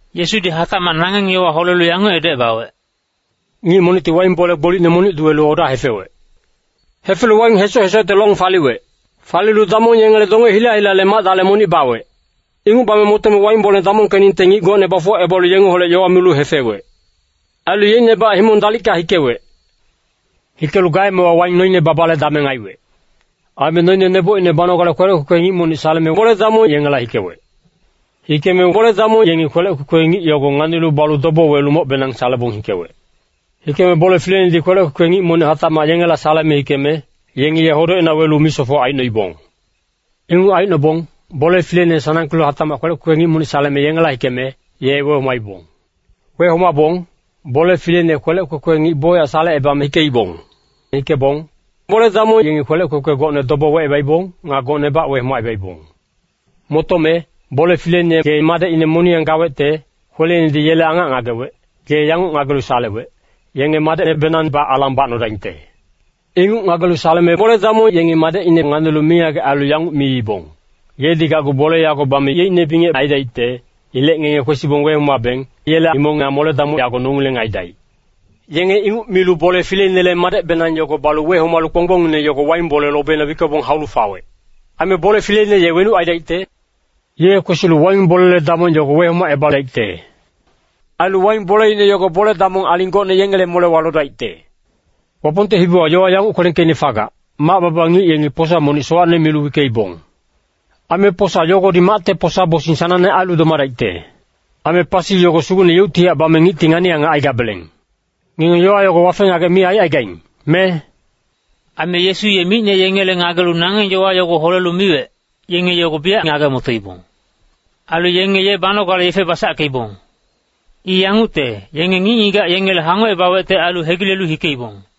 Yesudi hatacmac nangeng yowa holelu yanguc edocebawec, “Ngic monicti waing bole gbolicne monic duwelu oda hefewec. Hefelu waing hesoc-hesocte long faliwec. Falilu damong yengele donge hila-hilale mac-dale monic bawec. Inguc bame motome waing bole damongkeningte ngic gocne bafuwacebalu, yengeholec yowa milu hefewec. Ailu yeicnebac himong dalicka hikewec. Hikelu gaemewa waing noine babale dameng aiwec. Aime noine nebocine banogale kwelec kwekwe ngic monic saleme bole-damong yengela hikewec. Hikeme bole-damong yengi kwelec kwekwe ngic yogo nganilu balu dobo welu mocbenang salebong hikewec. Hikeme bole fileinedi kwelec kwekwe ngic monic hatacmac yengela saleme hikeme, yengi ye hodocina welu misofoc aicnoibong. “Inguc aicnobong, bole fileine ye sanangkelu hatacmac kwelec kwekwe ngic monic saleme yengela hikeme, ye wehomaibong. Wehomabong, bole fileine ye kwelec kwekwe ngic bocyac salecebame hikeibong. Hikebong bole-damong yengi kwelec kwekwe gocne dobo wecebaibong, nga gocnebac wehomacebaibong. “Motome, bole fileine ye madecine moniyang gawecte, kweleinedi yele angac ngagewec, ye yanguc ngagelu salewec, ‘Yenge madecnebenangbac alang bacnodaingte.’ “Inguc ngagelu saleme bole-damong yengi madecine nganilu mingagec ailu yanguc miibong, ‘Yedi gacgu bole yago bame yeicne bingec aidaicte. Ilec ngenge kwesibong wehomabeng, yele himong nga mole-damoc yago nongileng aidaic.’ Yenge inguc milu bole fileinele madecbenang yogo balu wehomalu, kponggbongine yogo waing bole lobina wickebong haulu fawec. “Aime bole fileine ye wenuc aidaicte? Ye kwesilu waing bolele damong yogo wehomacebadaicte. Ailu waing boleine yogo bole-damong aling gocne yengele molewa lodaicte. “Wapongte hibiwa yowa yanguc kwelengkeicne fagac, ‘Mac-baba ngic yengi posa monic sowacne milu wickeibong. Aime posa yogodi macte posa-bosing sanangne ailu domadaicte. Aime pasi yogo Sugucne yeuctihac bame ngicti ngani-angac aigabeleng.’ Ngenge yowa yogo wafe-ngagec mi aicaigaing, me?” Aime Yesu ye micne yengele ngagelu nangeng yowa yogo holelu miwec, yenge yogo biyac ngage-motoibong. Ailu yenge ye banogale yefe basackeibong. I yangucte, yenge ngic-ngigac yengele hangocebawecte ailu hegilelu hikeibong.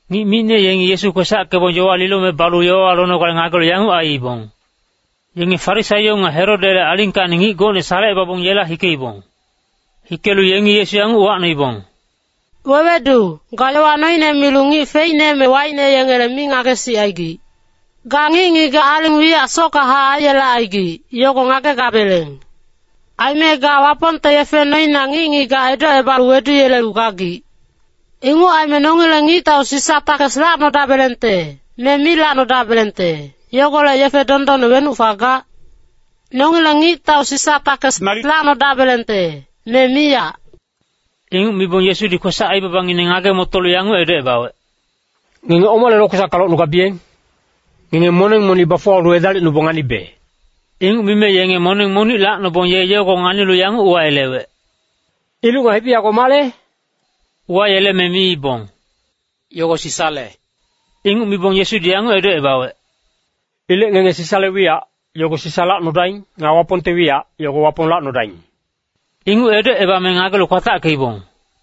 Ngic micne yengi Yesu kwesackebong yowa lilome balu yowawa lonogale ngagelu yanguc aiibong. Yenge Farisaio nga Herodele alingkacni ngic gocne salecebabong yela hikeibong. Hikelu yengi Yesu yanguc uwacnoibong, “Wewedu, ga yowa noine milu ngic feicne me waicne yengele mi ngagesicaigic. Ga ngic-ngigac aling wiyac sockahac aiyelecaigic, yogo ngagegabeleng. Aime ga Wapongte yefe noina ngic-ngigac edocebalu weduyelelu gagic. Inguc aime nongileng ngictau Sisa takes lacnodabelengte, me mi lacnodabelengte, yogolec yefe dondonne wenuc fagac? Nongileng ngictau Sisa takes nalic lacnodabelengte, me miyac?” Inguc mibong Yesudi kwesac-aibabangineng ngage-motolu yanguc edocebawec, “Ngenge omale lokwesacka locnugabiyeng? Ngenge moneng monic bafuwalu edalicnubong nganibe.” Inguc mime yenge moneng monic lacnobong ye yogo nganilu yanguc uwayelewec, “Iluc nga hibi yago male?” Uwayeleme miibong, “Yogo Sisale.” Inguc mibong Yesudi yanguc edocebawec, “Ilec ngenge Sisale wiyac, yogo Sisa lacnodaing. Nga Wapongte wiyac, yogo Wapong lacnodaing!” Inguc edocebame ngagelu kwatackeibong.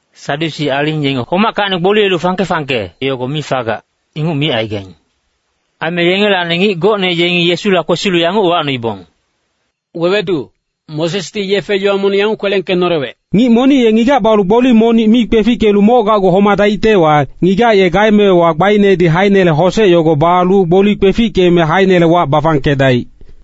Sadyusi aling yenge homackacni gboliyelu fangke-fangke yogo mi fagac, inguc micaigaing. Aime yengelacni ngic gocne yengi Yesula kwesilu yanguc uwacnoibong, “Wewedu, Mosesdi yefe-yowa monic yanguc kwelengkenolewec. ‘Ngic monic ye ngigac balu gboli monic mi kwefickelu moc gacgu homadaictewa, ngigac ye gaemewa gbainedi haeinele hosec yogo balu gboli kwefickeme haeinele wac bafangkedaic.’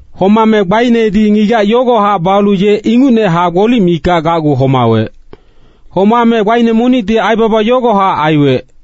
Homame gbainedi ngigac yogohac balu ye inguchac gboli mikac gacgu homawec. Homame gbaine monicti aibaba yogohac aiwec.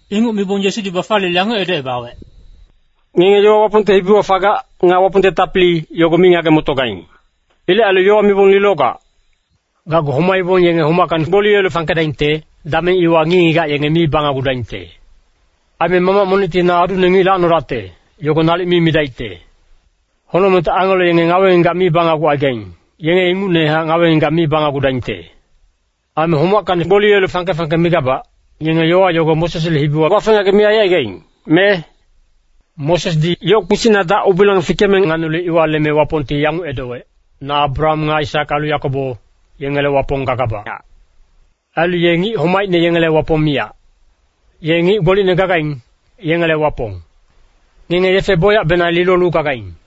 Inguc mibong Yesudi bafaliyelu yanguc edocebawec, “Ngenge yowa Wapongte hibiwa fagac, nga Wapongte tapili, yogo mi ngage-motogaing. Ilec ailu yowa mibong lilogac. Gacgu homaibong yenge homackacni gboliyelu fangkedaingte, dameng iwa ngic-ngigac yenge mi banagudaingte. Aime mamac monicti ‘Na adune ngic lacnodacte,’ yogo nalic mi midaicte. Honocmengte angelo yenge ngawe-ngigac mi banagucaigaing, yenge ingucnehac ngawe-ngigac mi banagudaingte. Aime homackacni gboliyelu fangke-fangke migabac, ngenge yowa yogo Mosesle hibiwa wafe-ngagec mi aicaigaing, me? Mosesdi yoc kpisicna dac-ubilang fikeme nganilu iwa leme Wapongti yanguc edowec, ‘Na Abraham nga Aisak ailu Yakobo, yengele Wapong gagabachac.’ Ailu ye ngic homaicne yengele Wapong miyac. Ye ngic gbolicne gagaing, yengele Wapong. Ngenge yefe bocyacbenang lilolu gagaing.”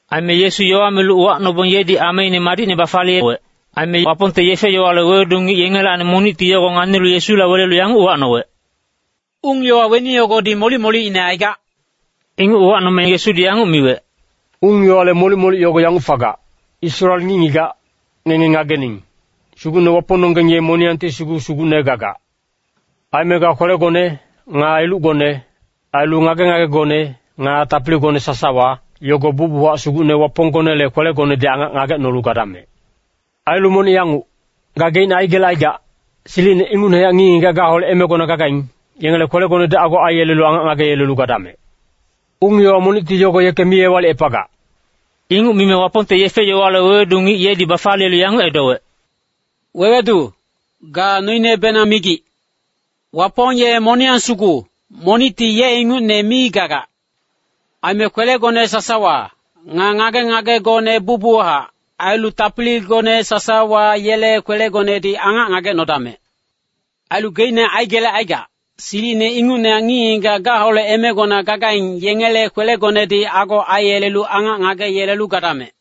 Aime Yesu yowa milu uwacnobong yedi ameine madicne bafaliyeyelewec. Aime Wapongte yefe-yowale wewedu ngic yengelacni monicti yogo nganilu Yesula welelu yanguc uwacnowec, “Ung-yowa weni yogodi molic-molicine aigac?” Inguc uwacnome Yesudi yanguc miwec, “Ung-yowale molic-molic yogo yanguc fagac, ‘Israel ngic-ngigac, ngenge ngagening, Sugucne Wapongnonggeng ye moniyangti sugu Sugucne gagac. Aime ga kwelegone, nga ilucgone, ailu ngage-ngagegone, nga tapiligone sasawa, yogo bucbuchac Sugucne Waponggonele kwelegonedi angac ngagecnolu gadamec.’ Ailu monic yanguc, ‘Gageicne aigelecaigac, silicine ingucnehac ngic-ngigac gale emewa gagaing, yengele kwelegonedi ago aiyelelu angac ngageyelelu gadamec.’ Ung-yowa monicti yogo yeke mi ewalicepagac.” Inguc mime Wapongte yefe-yowale wewedu ngic yedi bafaliyelu yanguc edowec, “Wewedu, ga noinebenang migic. Wapong ye moniyang sugu, monicti ye ingucne mi gagac. Aime kwelegone sasawa, nga ngage-ngagegone bucbuchac, ailu tapiligone sasawa yele kwelegonedi angac ngagecnodamec. Ailu geicne aigelecaigac, silicine ingucnehac ngic-ngigac gaholec emegona gagaing, yengele kwelegonedi ago aiyelelu angac ngageyelelu gadamec.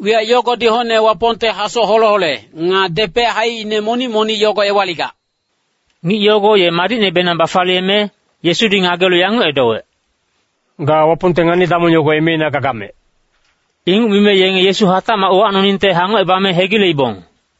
Wiyac yogodi hocne Wapongte hasoc hole-hole, nga depec haicine monic-monic yogo ewaligac.” Ngic yogo ye madicnebenang bafaliyeme, Yesudi ngagelu yanguc edowec, “Ga Wapongte ngani-damong yogo emeina gagamec.” Inguc mime yenge Yesu hatacmac uwacnoningte hangocebame hegileibong.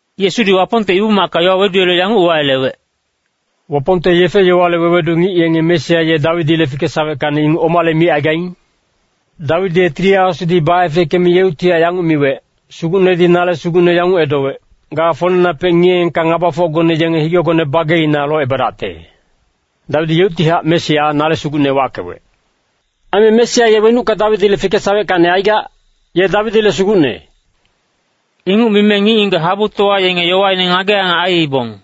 Yesudi Wapongte Ibu-macka yowa weduyelelu yanguc uwayelewec, “Wapongte yefe-yowale wewedu ngic yenge Mesia ye Dawidile fikesaweckacni inguc omale micaigaing? Dawidi ye Tili Asudi baefeckeme yeuctihac yanguc miwec, ‘Sugucnedi nale Sugucne yanguc edowec, “Ga folenapec ngiyeengka ngabafocgone yenge higegone bageina locebadacte.” ’ Dawidi yeuctihac Mesia ‘Nale Sugucne’ wackewec. Aime Mesia ye wenucka Dawidile fikesaweckacni aigac? Ye Dawidile Sugucne.” Inguc mime ngic-ngigac habutowa yenge yowaine ngage-angac aiibong.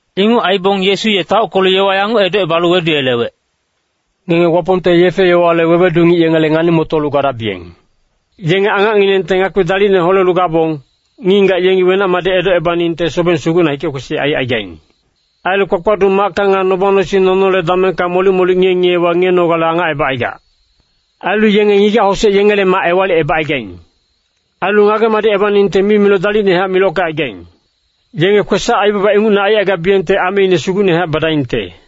Inguc aibong Yesu ye taockelu yowa yanguc edocebalu weduyelewec, “Ngenge Wapongte yefe-yowale wewedu ngic yengele ngani-motolu gadabiyeng. Yenge angacnginengte ngakpi dalicne holelu gabong, ngic-ngigac yengi wenac-madic edocebaningte, sobeng sugucna hike-kwesic aicaigaing. Ailu kpakpaduc macka nga noba-nosing nonole damengka molic-molic ngiye-ngiyewa ngiyenogale angacebacaigac. Ailu yenge ngigac-hosec yengele mac ewalicebacaigaing. Ailu ngage-madicebaningte mimiloc dalicnehac milockecaigaing. Yenge kwesac-aibaba ingucne aicaigabiyengte ameine sugucnehac badaingte.”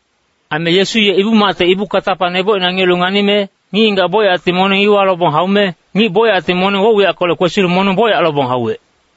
Aime Yesu ye Ibu-macte ibu katapa nebocina ngiyelu nganime, ngic-ngigac bocyacti moneng iwa lobong haume, ngic-ngigac bocyacti moneng woc-wiyackolec kwesilu moneng bocyac lobong hauwec.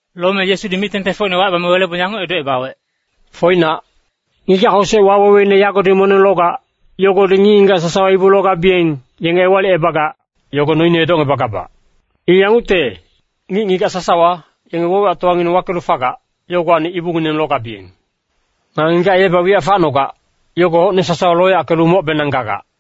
Lome Yesudi mic-tengtengfocine wacebame welebong yanguc edocebawec, “Foinac, ngigac-hosec waweweine yagodi moneng logac, yogodi ngic-ngigac sasawa ibu logabiyeng, yenge ewalicebagac, yogo noine edocngebagabac. I yangucte, ngic-ngigac sasawa, yenge woc-wiyactowangineng wakelu fagac, yogowacni ibungineng logabiyeng. Nga ngigac yebac wiyac facnogac, yogo hocne sasawa loyackelu mocbenang gagac.”